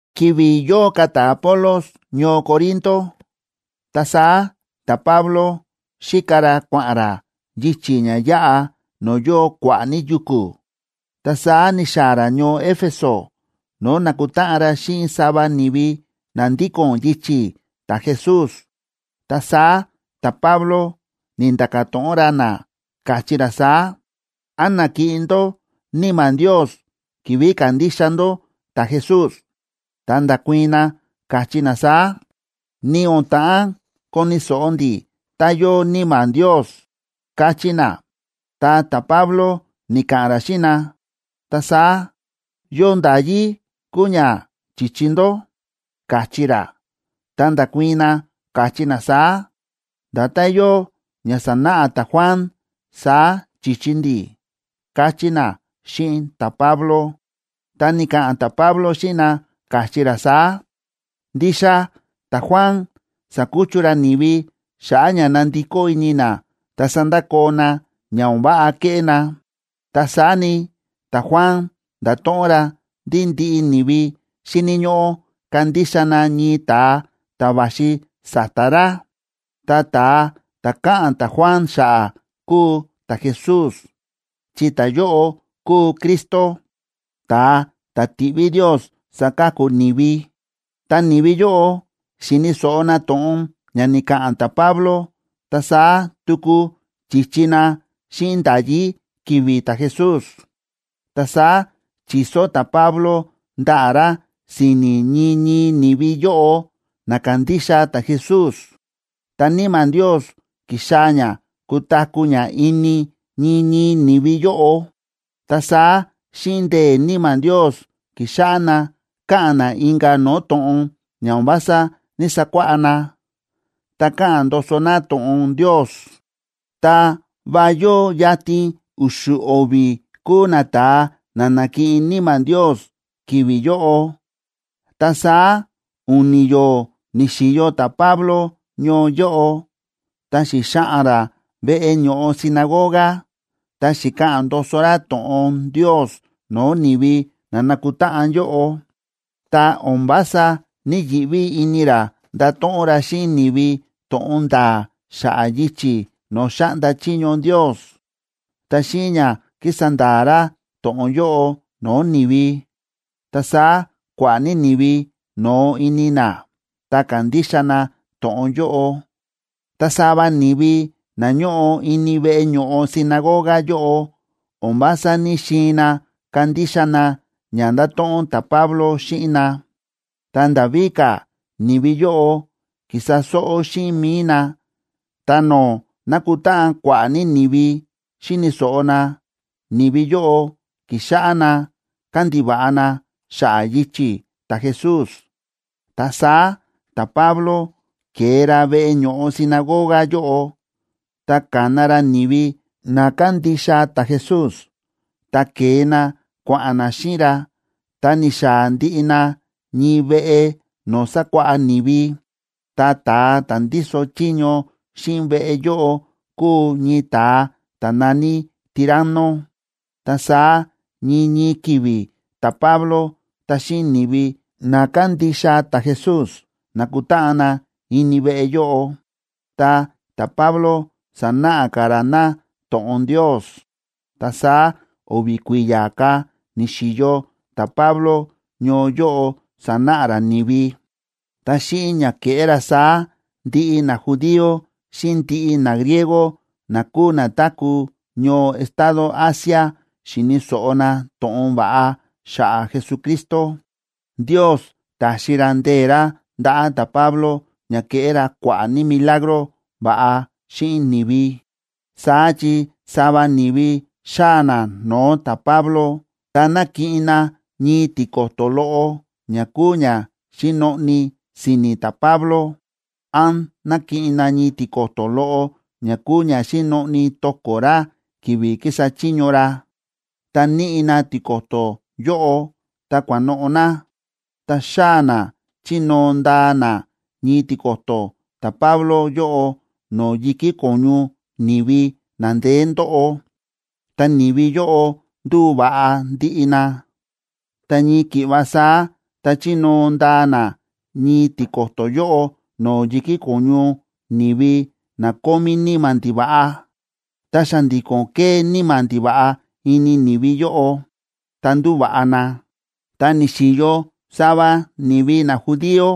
Ki̱vi̱ yóo ka̱ ta̱Apolos ñoo Corinto, ta saá ta̱Pablo xíka ra kua̱ꞌa̱n ra yichi̱ ña yáꞌa no̱o̱ yóo kua̱ꞌa̱ ní yuku̱, ta saá ni̱xaa̱ ra ñoo Éfeso, no̱o̱ na̱kutáꞌan ra xíꞌin sava ni̱vi na ndíko̱n yichi̱ ta̱Jesús. Ta saá ta̱Pablo ni̱nda̱ka̱ to̱ꞌon ra na, káchí ra saá: ―¿Án na̱kiꞌin ndó Níma̱ Ndios ki̱vi̱ ka̱ndixa ndó ta̱Jesús? Ta nda̱kuii̱n na, káchí na saá: ―Ni o̱n ta̱ꞌán koni̱ so̱ꞌo ndi̱ tá yóo Níma̱ Ndios ―káchí na. Ta ta̱Pablo ni̱ka̱ꞌa̱n ra xíꞌin na: ―Ta saá, ¿yo nda̱yí kúu ña chi̱chi ndó? ―káchí ra. Ta nda̱kuii̱n na, káchí na saá: ―Nda̱tán yóo ña sa̱náꞌa ta̱Juan, saá chi̱chi ndi̱ ―káchí na xíꞌin ta̱Pablo. Ta ni̱ka̱ꞌa̱n ta̱Pablo xíꞌin na, káchí ra saá: ―Ndixa ta̱Juan sa̱kuchu ra ni̱vi xa̱ꞌa̱ ña na̱ndikó ini na ta sa̱ndakoo na ña o̱n váꞌa kéꞌé na. Ta saá ni, ta̱Juan nda̱to̱ꞌon ra ndí ndiꞌi ni̱vi xíni̱ ñóꞌó kandixa na ñii ta̱a ta̱ va̱xi sa̱ta̱ ra. Ta ta̱a ta̱ káꞌa̱n ta̱Juan xa̱ꞌa̱ kúu ta̱Jesús, chi ta̱yóꞌo kúu Cristo, ta̱a ta̱ ti̱ꞌví Ndios saka̱ku ni̱vi. Tá ni̱vi yóꞌo xi̱ni̱ so̱ꞌo na to̱ꞌon ña ni̱ka̱ꞌa̱n ta̱Pablo, ta saá tuku chi̱chi na xíꞌin nda̱yí ki̱vi̱ ta̱Jesús. Ta saá chi̱so ta̱Pablo ndaꞌa̱ ra si̱ni̱ ñii ñii ni̱vi yóꞌo na ka̱ndixa ta̱Jesús, ta Níma̱ Ndios ki̱xaa̱ ña kutaku̱ ña ini ñii ñii ni̱vi yóꞌo. Ta saá xíꞌin ndee̱ Níma̱ Ndios, ki̱xáꞌá na káꞌa̱n na inka̱ no̱o̱ to̱ꞌon ña o̱n vása ní‑sakuáꞌá na, ta káꞌa̱n ndoso na to̱ꞌon Ndios. Ta va yóo yatin u̱xu̱ o̱vi̱ kúu nata̱a na na̱kiꞌin Níma̱ Ndios ki̱vi̱ yóꞌo. Ta saá u̱ni̱ yo̱o̱ ni̱xi̱yo ta̱Pablo ñoo yóꞌo, ta xi̱xaꞌa̱n ra veꞌe ño̱ꞌo sinagoga, ta xi̱ka̱ꞌa̱n ndoso ra to̱ꞌon Ndios no̱o̱ ni̱vi na na̱kutáꞌan yóꞌo. Ta o̱n vása ní‑yiꞌví ini ra ndáto̱ꞌon ra xíꞌin ni̱vi to̱ꞌon nda̱a̱ xa̱ꞌa̱ yichi̱ no̱o̱ xáꞌnda chiño Ndios. Ta xíꞌin ña kísa nda̱a̱ ra to̱ꞌon yóꞌo no̱o̱ ni̱vi, ta saá kua̱ꞌa̱ ní ni̱vi no̱o ini na, ta ka̱ndixa na to̱ꞌon yóꞌo. Ta sava ni̱vi na ñóꞌo ini veꞌe ño̱ꞌo sinagoga yóꞌo o̱n vása ní‑xiin na kandixa na ña ndáto̱ꞌon ta̱Pablo xíꞌin na. Ta nda̱ víka̱, ni̱vi yóꞌo ki̱sa sóꞌó xíꞌin mi̱i na, ta no̱o̱ nákutáꞌan kua̱ꞌa̱ ní ni̱vi xíni̱ so̱ꞌo na, ni̱vi yóꞌo ki̱xáꞌá na kándiva̱ꞌa na xa̱ꞌa̱ yichi̱ ta̱Jesús. Ta saá ta̱Pablo ke̱e ra veꞌe ño̱ꞌo sinagoga yóꞌo, ta ka̱na ra ni̱vi na kándixa ta̱Jesús, ta ke̱e na kua̱ꞌa̱n na xíꞌin ra, ta ni̱xaa̱ ndiꞌi na ñii veꞌe no̱o̱ sákuáꞌá ni̱vi. Ta ta̱a ta̱ ndíso chiño xíꞌin veꞌe yóꞌo kúu ñii ta̱a ta̱ na̱ní Tiranno. Ta saá ñii ñii ki̱vi̱ ta̱Pablo ta xíꞌin ni̱vi na kándixa ta̱Jesús nákutáꞌan na ini veꞌe yóꞌo, ta ta̱Pablo sánáꞌa ka̱ ra na to̱ꞌon Ndios. Ta saá o̱vi̱ kui̱ya̱ ka̱ ni̱xi̱yo ta̱Pablo ñoo yóꞌo sánáꞌa ra ni̱vi. Ta xíꞌin ña ke̱ꞌé ra saá, ndiꞌi najudío xíꞌin ndiꞌi nagriego na kúu na táku̱ ñoo estado Asia xi̱ni̱ so̱ꞌo na to̱ꞌon va̱ꞌa xa̱ꞌa̱ Jesucristo. Ndios ta̱xi ra ndee̱ ra ndaꞌa̱ ta̱Pablo ña ke̱ꞌé ra kua̱ꞌa̱ ní milagro va̱ꞌa xíꞌin ni̱vi. Saá chi sava ni̱vi xáa̱ na no̱o̱ ta̱Pablo, ta nákiꞌin na ñii tiko̱to̱ loꞌo ña kúu ña xi̱noꞌni si̱ni̱ ta̱Pablo, án nákiꞌin na ñii tiko̱to̱ loꞌo ña kúu ña xi̱noꞌni to̱ko̱ ra ki̱vi̱ ki̱sa chiño ra, ta níꞌi na tiko̱to̱ yóꞌo, ta kua̱noꞌo̱ na, ta xáa̱ na chínóo ndaa na ñii tiko̱to̱ ta̱Pablo yóꞌo no̱o̱ yi̱kí ko̱ñu ni̱vi na ndeé ndóꞌo, ta ni̱vi yóꞌo ndu̱va̱ꞌa ndiꞌi na. Ta ñii ki̱ꞌva saá tá chínóo ndaa na ñii tiko̱to̱ yóꞌo no̱o̱ yi̱kí ko̱ñu ni̱vi na kómí níma̱ ndiva̱ꞌa, ta xa̱ndi̱ko̱n ke̱e níma̱ ndiva̱ꞌa ini ni̱vi yóꞌo, ta ndu̱va̱ꞌa na. Ta ni̱xi̱yo sava ni̱vi najudío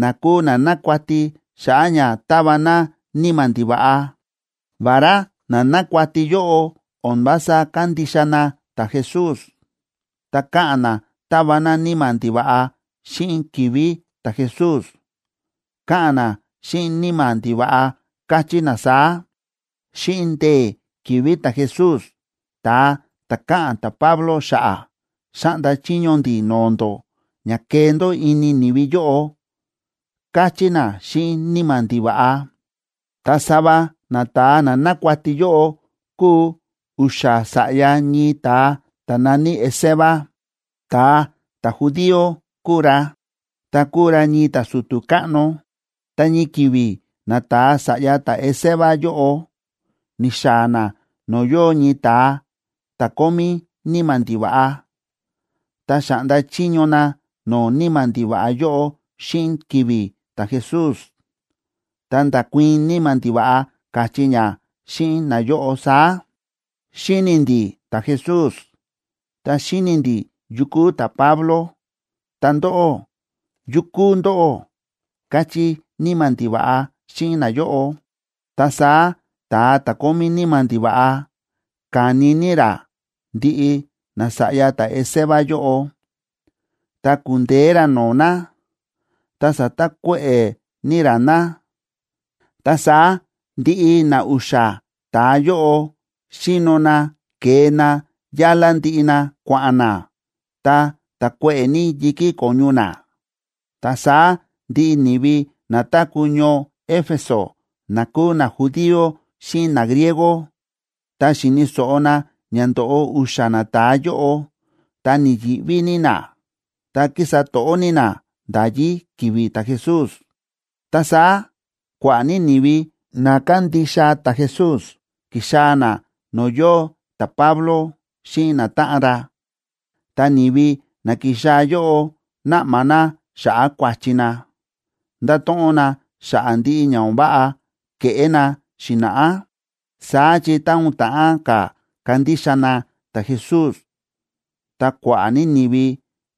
na kúu na nákuati xa̱ꞌa̱ ña táva na níma̱ ndiva̱ꞌa. Vará na nákuati yóꞌo o̱n vása kándixa na ta̱Jesús, ta káꞌa̱n na tava na níma̱ ndiva̱ꞌa xíꞌin ki̱vi̱ ta̱Jesús. Káꞌa̱n na xíꞌin níma̱ ndiva̱ꞌa, káchí na saá: ―Xíꞌin ndee̱ ki̱vi̱ ta̱Jesús, ta̱a ta̱ káꞌa̱n ta̱Pablo xa̱ꞌa̱, xáꞌnda chiño ndi̱ no̱o̱ ndó ña kee ndó ini ni̱vi yóꞌo ―káchí na xíꞌin níma̱ ndiva̱ꞌa. Ta sava nata̱a na nákuati yóꞌo kúu u̱xa̱ sa̱ꞌya ñii ta̱a ta̱ na̱ní Esceva, ta̱a ta̱judío kúu ra, ta kúu ra ñii ta̱su̱tu̱ káꞌno. Ta ñii ki̱vi̱ nata̱a sa̱ꞌya ta̱Esceva yóꞌo ni̱xaa̱ na no̱o̱ yóo ñii ta̱a ta̱ kómí níma̱ ndiva̱ꞌa, ta xa̱ꞌnda chiño na no̱o̱ níma̱ ndiva̱ꞌa yóꞌo xíꞌin ki̱vi̱ ta̱Jesús, ta nda̱kuii̱n níma̱ ndiva̱ꞌa, káchí ña xíꞌin nayóꞌo saá: ―Xíni̱ ndi̱ ta̱Jesús, ta xíni̱ ndi̱ yu kúu ta̱Pablo, ta ndóꞌó, ¿yu kúu ndóꞌó? ―káchí níma̱ ndiva̱ꞌa xíꞌin nayóꞌo. Ta saá ta̱a ta̱ kómí níma̱ ndiva̱ꞌa ka̱ni ní ra ndiꞌi nasa̱ꞌya ta̱Esceva yóꞌo, ta ku̱ndeé ra no̱o̱ na, ta sa̱takuéꞌe̱ ní ra na. Ta saá ndiꞌi na u̱xa̱ ta̱a yóꞌo xi̱no na ke̱e na yálá ndiꞌi na, kua̱ꞌa̱n na, ta ta̱kuéꞌe̱ ní yi̱kí ko̱ñu na. Ta saá ndiꞌi ni̱vi na táku̱ ñoo Éfeso, na kúu najudío xíꞌin nagriego, tá xi̱ni̱ so̱ꞌo na ña ndo̱ꞌo u̱xa̱ nata̱a yóꞌo, ta ni̱yi̱ꞌví ní na, ta kísa to̱ꞌó ní na nda̱yí ki̱vi̱ ta̱Jesús. Ta saá kua̱ꞌa̱ ní ni̱vi na kándixa ta̱Jesús ki̱xaa̱ na no̱o̱ yóo ta̱Pablo xíꞌin natáꞌan ra, ta ni̱vi na ki̱xaa̱ yóꞌo na̱ꞌma na xa̱ꞌa̱ kua̱chi na, nda̱to̱ꞌon na xa̱ꞌa̱ ndiꞌi ña o̱n váꞌa ke̱ꞌé na xi̱na̱ꞌá. Saá chi tá o̱n ta̱ꞌán ka̱ kandixa na ta̱Jesús, ta kua̱ꞌa̱ ní ni̱vi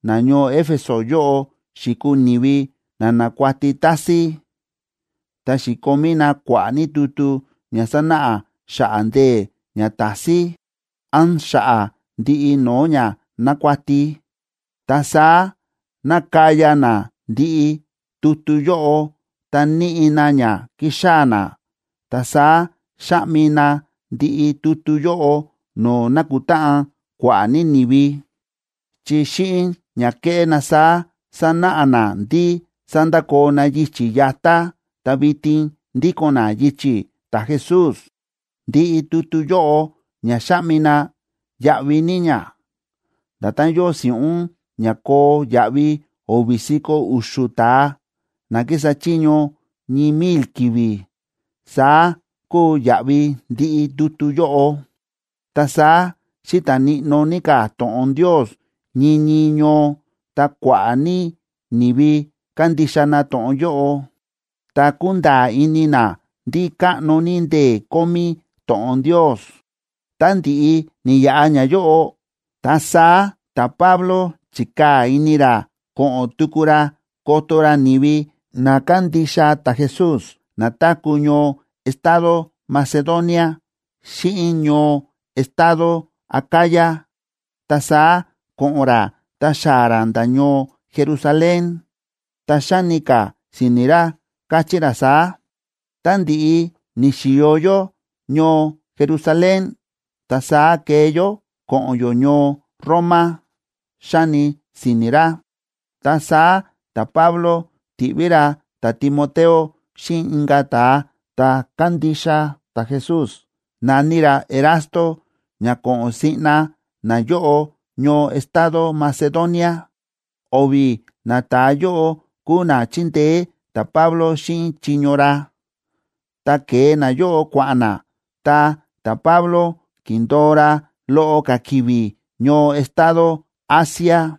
nañoo Éfeso yóꞌo xi̱kuu ni̱vi na nákuati tásín, ta xi̱komí na kua̱ꞌa̱ ní tutu ña sánáꞌa xa̱ꞌa̱ ndee̱ ñatásín, án xa̱ꞌa̱ ndiꞌi no̱o̱ ña nákuati. Ta saá na̱kaya na ndiꞌi tutu yóꞌo ta níꞌi na ña ki̱xaa̱ na, ta saá xa̱ꞌmi na ndiꞌi tutu yóꞌo no̱o̱ na̱kutáꞌan kua̱ꞌa̱ ní ni̱vi, chi xíꞌin ña ke̱ꞌé na saá, sa̱náꞌa na ndí sa̱ndakoo na yichi̱ yatá ta vitin ndíko̱n na yichi̱ ta̱Jesús. Ndiꞌi tutu yóꞌo ña xa̱ꞌmi na, yáꞌví ní ña, nda̱tán yóo si̱ꞌún ña koo yaꞌvi o̱vi̱ si̱ko̱ u̱xu̱ ta̱a, na kísa chiño ñii mil ki̱vi̱, saá kúu yaꞌvi ndiꞌi tutu yóꞌo. Ta saá xíta̱ níꞌnó ní ka̱ to̱ꞌon Ndios ñii ñii ñoo, ta kua̱ꞌa̱ ní ni̱vi ka̱ndixa na to̱ꞌon yóꞌo, ta ku̱nda̱a̱ ini na ndí káꞌno ní ndee̱ kómí to̱ꞌon Ndios. Tá ndi̱ꞌi ni̱yaꞌa ñayóꞌo, ta saá ta̱Pablo chi̱kaa̱ ini ra ko̱ꞌo̱n tuku ra koto ra ni̱vi na kándixa ta̱Jesús na táku̱ ñoo estado Macedonia xíꞌin ñoo estado Acaya, ta saá ko̱ꞌo̱n ra ta xaa̱ ra nda̱ ñoo Jerusalén. Ta xáni ka̱ si̱ni̱ ra, káchí ra saá: ―Tá ndi̱ꞌi ni̱xi̱yo yó ñoo Jerusalén, ta saá kee yó ko̱ꞌo̱n yó ñoo Roma ―xáni si̱ni̱ ra. Ta saá ta̱Pablo ti̱ꞌví ra ta̱Timoteo xíꞌin inka̱ ta̱a ta̱ kándixa ta̱Jesús na̱ní ra Erasto ña ko̱ꞌo̱n siꞌna nayóꞌo ñoo estado Macedonia. O̱vi̱ nata̱a yóꞌo kúu na chíndeé ta̱Pablo xíꞌin chiño ra. Tá ke̱e nayóꞌo kua̱ꞌa̱n na, ta ta̱Pablo ki̱ndo̱o ra loꞌo ka̱ ki̱vi̱ ñoo estado Asia.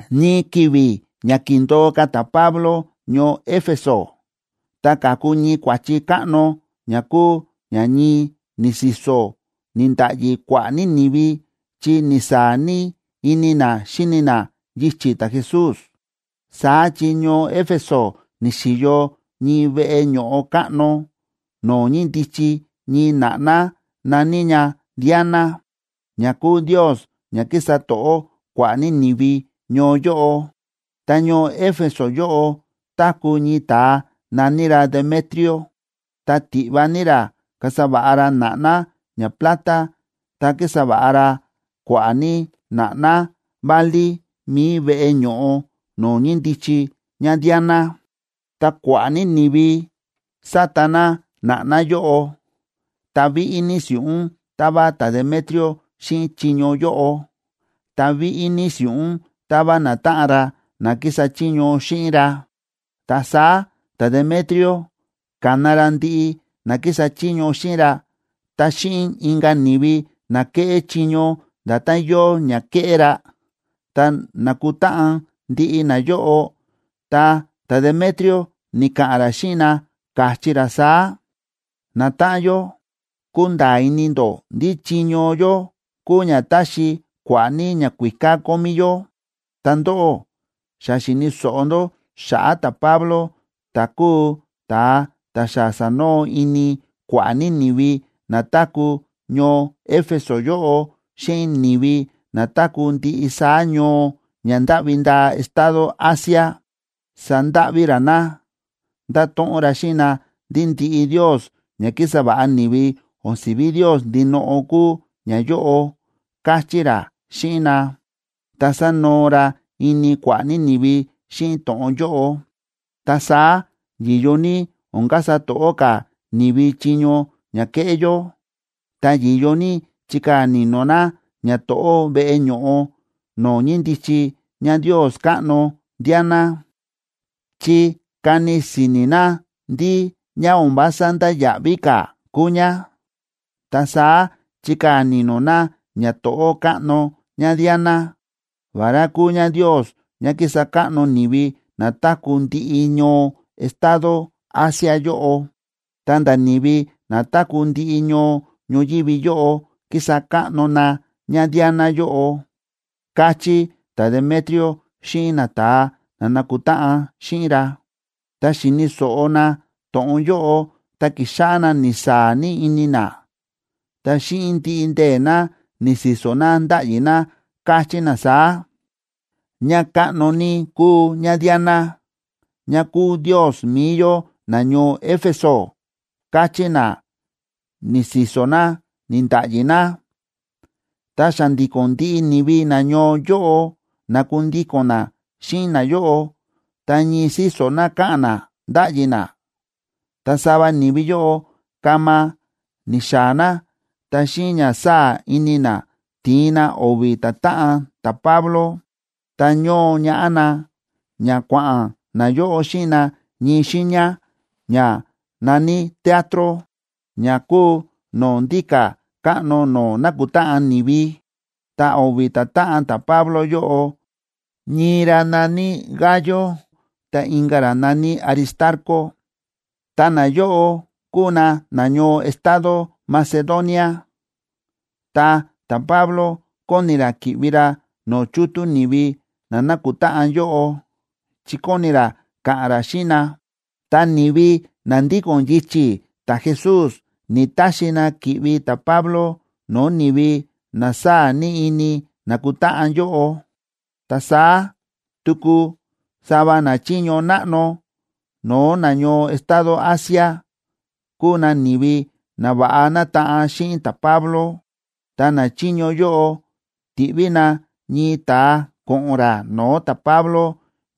Ñii ki̱vi̱ ña kíndo̱o ka̱ ta̱Pablo ñoo Éfeso, ta ka̱ku ñii kua̱chi káꞌno, ña kúu ña ñii ni̱si̱so̱, ni̱nda̱ꞌyi kua̱ꞌa̱ ní ni̱vi chi ni̱saa̱ ní ini na xíni na yichi̱ ta̱Jesús. Saá chi ñoo Éfeso ni̱xi̱yo ñii veꞌe ño̱ꞌo káꞌno, no̱o̱ ñíndichi ñii na̱ꞌná na̱ní ña Diana, ña kúu ndios ña kísa to̱ꞌó kua̱ꞌa̱ ní ni̱vi ñoo yóꞌo. Ta ñoo Éfeso yóꞌo táku̱ ñii ta̱a na̱ní ra Demetrio, ta tiꞌva ní ra kasa va̱ꞌa ra na̱ꞌná ñaplata, ta kísa va̱ꞌa ra kua̱ꞌa̱ ní na̱ꞌná válí mi̱i veꞌe ño̱ꞌo no̱o̱ ñíndichi ñaDiana. Ta kua̱ꞌa̱ ní ni̱vi sáta na na̱ꞌná yóꞌo, ta víꞌí ní si̱ꞌún táva ta̱Demetrio xíꞌin chiño yóꞌo, ta víꞌí ní si̱ꞌún táva natáꞌan ra na kísa chiño xíꞌin ra. Ta saá ta̱Demetrio ka̱na ra ndiꞌi na kísa chiño xíꞌin ra ta xíꞌin inka̱ ni̱vi na kéꞌé chiño nda̱tán yóo ña kéꞌé ra. Tá na̱kutáꞌan ndiꞌi nayóꞌo, ta ta̱Demetrio ni̱ka̱ꞌa̱n ra xíꞌin na, káchí ra saá: ―Natáꞌan yó, kúnda̱a̱ ini ndó ndí chiño yó kúu ña táxi kua̱ꞌa̱ ní ñakuíká kómí yó. Ta ndóꞌó, xa xi̱ni̱ so̱ꞌo ndó xa̱ꞌa̱ ta̱Pablo ta̱ kúu ta̱a ta̱ xa sa̱noo ini kua̱ꞌa̱ ní ni̱vi na táku̱ ñoo Éfeso yóꞌo, xíꞌin ni̱vi na táku̱ ndiꞌi saá ñoo ña ndáꞌvi ndaa estado Asia. Sa̱ndáꞌví ra na, ndáto̱ꞌon ra xíꞌin na ndí ndiꞌi ndios ña ki̱sa va̱ꞌa ni̱vi o̱n si̱ví ndios ndinoꞌo kúu ñayóꞌo, káchí ra xíꞌin na, ta sa̱noo ra ini kua̱ꞌa̱ ní ni̱vi xíꞌin to̱ꞌon yóꞌo. Ta saá yi̱yo ní o̱n kasa to̱ꞌó ka̱ ni̱vi chiño ña kéꞌé yó, ta yi̱yo ní chikaa̱ ni̱no̱ na ñato̱ꞌó veꞌe ño̱ꞌo no̱o̱ ñíndichi ñandios káꞌno Diana, chi kani si̱ni̱ na ndí ña o̱n vása ndáya̱ꞌví ka̱ kúu ña. Ta saá chikaa̱ ni̱no̱ na ñato̱ꞌó káꞌno ñaDiana, vará kúu ñandios ña kísa káꞌno ni̱vi na táku̱ ndiꞌi ñoo estado Asia yóꞌo, ta̱nda̱ ni̱vi na táku̱ ndiꞌi ñoo ñoyívi yóꞌo kísa káꞌno na ñaDiana yóꞌo ―káchí ta̱Demetrio xíꞌin nata̱a na na̱kutáꞌan xíꞌin ra. Tá xi̱ni̱ so̱ꞌo na to̱ꞌon yóꞌo, ta ki̱xáꞌá na ni̱saa̱ ní ini na, ta xíꞌin ndiꞌi ndee̱ na, ni̱si̱so̱ na, ndáꞌyi na, káchí na saá: ―¡Ñakáꞌno ní kúu ñaDiana, ña kúu ndios mi̱i yó nañoo Éfeso! ―káchí na, ni̱si̱so̱ na, ni̱nda̱ꞌyi na. Ta xa̱ndi̱ko̱n ndiꞌi ni̱vi nañoo yóꞌo na̱kundíko̱n na xíꞌin nayóꞌo, ta ñii síso̱ na káꞌa̱n na, ndáꞌyi na. Ta sava ni̱vi yóꞌo kama ni̱xaa̱ na, ta xíꞌin ña sáa̱ ini na, ti̱in na o̱vi̱ ta̱táꞌan ta̱Pablo, ta ño̱o ñaꞌá na ña kua̱ꞌa̱n nayóꞌo xíꞌin na ñii xiiña ña na̱ní teatro, ña kúu no̱o̱ ndíka̱ káꞌno no̱o̱ nákutáꞌan ni̱vi. Ta o̱vi̱ ta̱táꞌan ta̱Pablo yóꞌo, ñii ra na̱ní Gayo, ta inka̱ ra na̱ní Aristarco, ta nayóꞌo kúu na nañoo estado Macedonia. Ta ta̱Pablo kóni ra ki̱ꞌvi ra no̱o̱ chútú ni̱vi na na̱kutáꞌan yóꞌo, chi kóni ra ka̱ꞌa̱n ra xíꞌin na, ta ni̱vi na ndíko̱n yichi̱ ta̱Jesús ni̱‑taxi na ki̱ꞌvi ta̱Pablo no̱o̱ ni̱vi na sáa̱ ní ini na̱kutáꞌan yóꞌo. Ta saá tuku sava nachiño náꞌno no̱o̱ nañoo estado Asia, kúu na ni̱vi na va̱ꞌa nátaꞌan xíꞌin ta̱Pablo. Ta nachiño yóꞌo ti̱ꞌví na ñii ta̱a ko̱ꞌo̱n ra no̱o̱ ta̱Pablo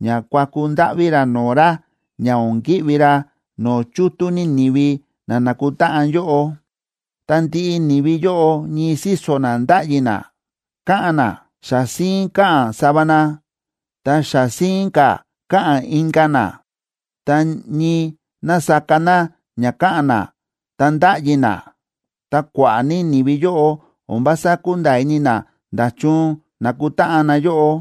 ña kuaku ndáꞌví ra no̱o̱ ra ña o̱n ki̱ꞌvi ra no̱o̱ chútú ní ni̱vi na na̱kutáꞌan yóꞌo. Ta ndiꞌi ni̱vi yóꞌo ñii síso̱ na ndáꞌyi na, káꞌa̱n na. Xa síín káꞌa̱n sava na, ta xa síín ka̱ káꞌa̱n inka̱ na. Ta ñii násaka na ña káꞌa̱n na ta ndáꞌyi na, ta kua̱ꞌa̱ ní ni̱vi yóꞌo o̱n vása kúnda̱a̱ ini na nda̱chun na̱kutáꞌan na yóꞌo.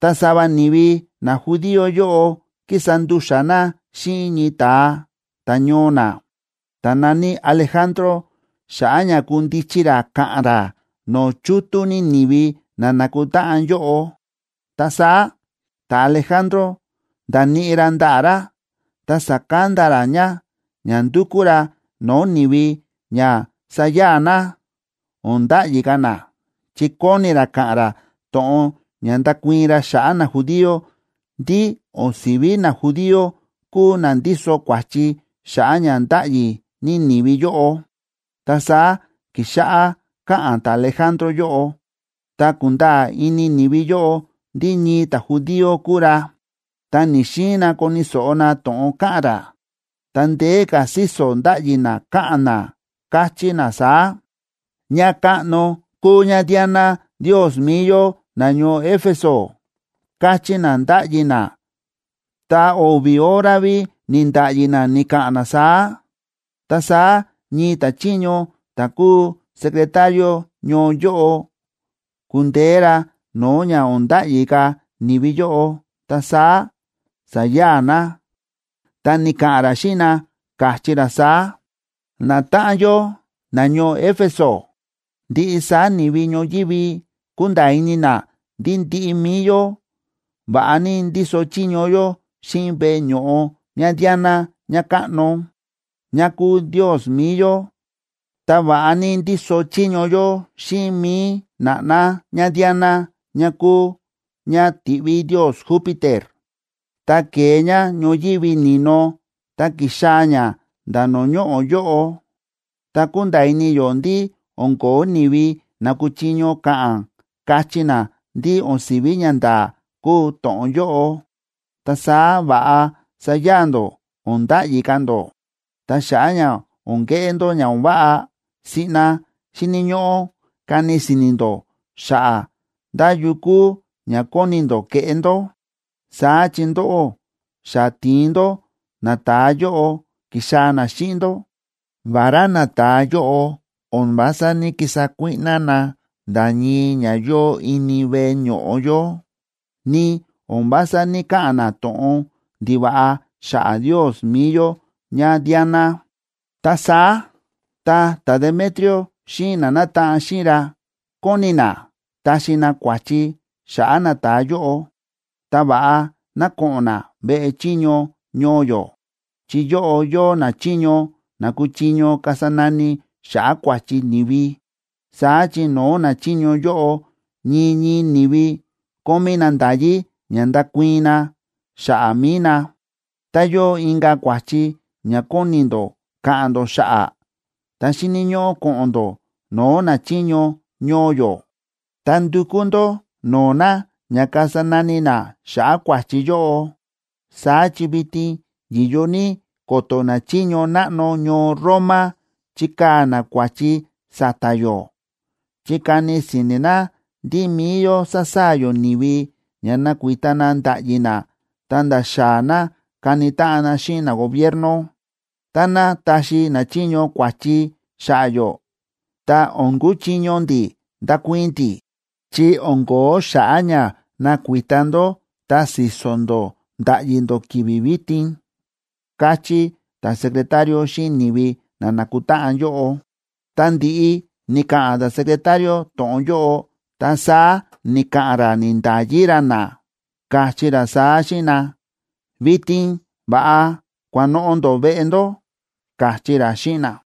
Ta sava ni̱vi najudío yóꞌo ki̱sa ndu̱xa̱ na xíꞌin ñii ta̱a ta̱ñoo na, ta̱ na̱ní Alejandro, xa̱ꞌa̱ ña kundichi ra ka̱ꞌa̱n ra no̱o̱ chútú ní ni̱vi na na̱kutáꞌan yóꞌo. Ta saá ta̱Alejandro nda̱níꞌi ra ndaꞌa̱ ra ta sa̱kanda ra ña ña ndukú ra no̱o̱ ni̱vi ña saya̱a̱ na, o̱n nda̱ꞌyi ka̱ na, chi kóni ra ka̱ꞌa̱n ra to̱ꞌon ña ndakuii̱n ra xa̱ꞌa̱ najudío ndí o̱n si̱ví najudío kúu na ndíso kua̱chi xa̱ꞌa̱ ña ndáꞌyi ní ni̱vi yóꞌo. Ta saá ki̱xáꞌá káꞌa̱n ta̱Alejandro yóꞌo, ta kúnda̱a̱ ini ni̱vi yóꞌo ndí ñii ta̱judío kúu ra, ta ni̱‑xiin na koni̱ so̱ꞌo na to̱ꞌon káꞌa̱n ra, ta ndeé ka̱ síso̱ ndáꞌyi na káꞌa̱n na, káchí na saá: ―¡Ñakáꞌno kúu ñaDiana ndios mi̱i yó nañoo Éfeso! ―káchí na, ndáꞌyi na, ta o̱vi̱ hora ví ni̱nda̱ꞌyi na ni̱ka̱ꞌa̱n na saá. Ta saá ñii ta̱chiño ta̱ kúu secretario ñoo yóꞌo, ku̱ndeé ra no̱o̱ ña o̱n nda̱ꞌyi ka̱ ni̱vi yóꞌo, ta saá sa̱ya̱a̱ na. Ta ni̱ka̱ꞌa̱n ra xíꞌin na, káchí ra saá: ―Natáꞌan yó nañoo Éfeso, ndiꞌi saá ni̱vi ñoyívi kúnda̱a̱ ini na ndí ndiꞌi mi̱i yó va̱ꞌa ní ndíso chiño yó xíꞌin veꞌe ño̱ꞌo ñaDiana ñakáꞌno, ña kúu ndios mi̱i yó, ta va̱ꞌa ní ndíso chiño yó xíꞌin mi̱i na̱ꞌná ñaDiana ña kúu ña ti̱ꞌví ndios Júpiter, ta ke̱e ña ñoyívi ni̱no ta ki̱xaa̱ ña nda̱ no̱o̱ ñoꞌo̱ yóꞌo. Ta kúnda̱a̱ ini yó ndí o̱n ko̱ó ni̱vi na kúchiño ka̱ꞌa̱n, kachí na ndí o̱n si̱ví ñanda̱a̱ kúu to̱ꞌon yóꞌo. Ta saá va̱ꞌa saya̱a̱ ndó, o̱n nda̱ꞌyi ka̱ ndó. Ta xa̱ꞌa̱ ña o̱n keꞌé ndó ña o̱n váꞌa, siꞌna xíni̱ ñóꞌó kani si̱ni̱ ndó xa̱ꞌa̱ ndá yu kúu ña kóni ndó keꞌé ndó. Saá chi ndóꞌó, xa ti̱in ndó nata̱a yóꞌo ki̱xaa̱ na xíꞌin ndó, vará nata̱a yóꞌo o̱n vása ní‑kisa kuíꞌná na nda̱ ñii ña yóo ini veꞌe ño̱ꞌo yó, ni o̱n vása ní‑kaꞌa̱n na to̱ꞌon ndiva̱ꞌa xa̱ꞌa̱ ndios mi̱i yó ñaDiana. Ta saá tá ta̱Demetrio xíꞌin na nátaꞌan xíꞌin ra kóni na taxi na kua̱chi xa̱ꞌa̱ nata̱a yóꞌo, ta va̱ꞌa ná ko̱ꞌo̱n na veꞌe chiño ñoo yó, chi yóꞌo yóo nachiño na kúchiño kasa nani xa̱ꞌa̱ kua̱chi ni̱vi. Saá chi no̱o̱ nachiño yóꞌo ñii ñii ni̱vi kómí na nda̱yí ña ndakuii̱n na xa̱ꞌa̱ mi̱i na. Tá yóo inka̱ kua̱chi ña kóni ndó ka̱ꞌa̱n ndó xa̱ꞌa̱, ta xíni̱ ñóꞌó ko̱ꞌo̱n ndó no̱o̱ nachiño ñoo yó, ta ndukú ndó no̱o̱ na ña kasa nani na xa̱ꞌa̱ kua̱chi yóꞌo. Saá chi vitin yi̱yo ní ko̱to̱ nachiño náꞌno ñoo Roma chikaa̱ na kua̱chi sa̱ta̱ yó, chi kani si̱ni̱ na ndí mi̱i yó sa̱saa̱ yó ni̱vi ña nakuita na nda̱ꞌyi na ta̱nda̱ xaa̱ na kani táꞌan na xíꞌin nagobierno. Táná taxi nachiño kua̱chi xa̱ꞌa̱ yó, ta o̱n kuchiño ndi̱ ndakuii̱n ndi̱, chi o̱n ko̱ó xa̱ꞌa̱ ña na̱kuita ndó ta síso̱ ndó ndáꞌyi ndó ki̱vi̱ vitin ―káchí ta̱secretario xíꞌin ni̱vi na nákutáꞌan yóꞌo. Tá ndi̱ꞌi ni̱ka̱ꞌa̱n ta̱secretario to̱ꞌon yóꞌo, ta saá ni̱ka̱ꞌa̱n ra ni̱nda̱yi ra na, káchí ra saá xíꞌin na: ―Vitin va̱ꞌa kua̱ꞌa̱n noꞌo̱ ndó veꞌe ndó ―káchí ra xíꞌin na.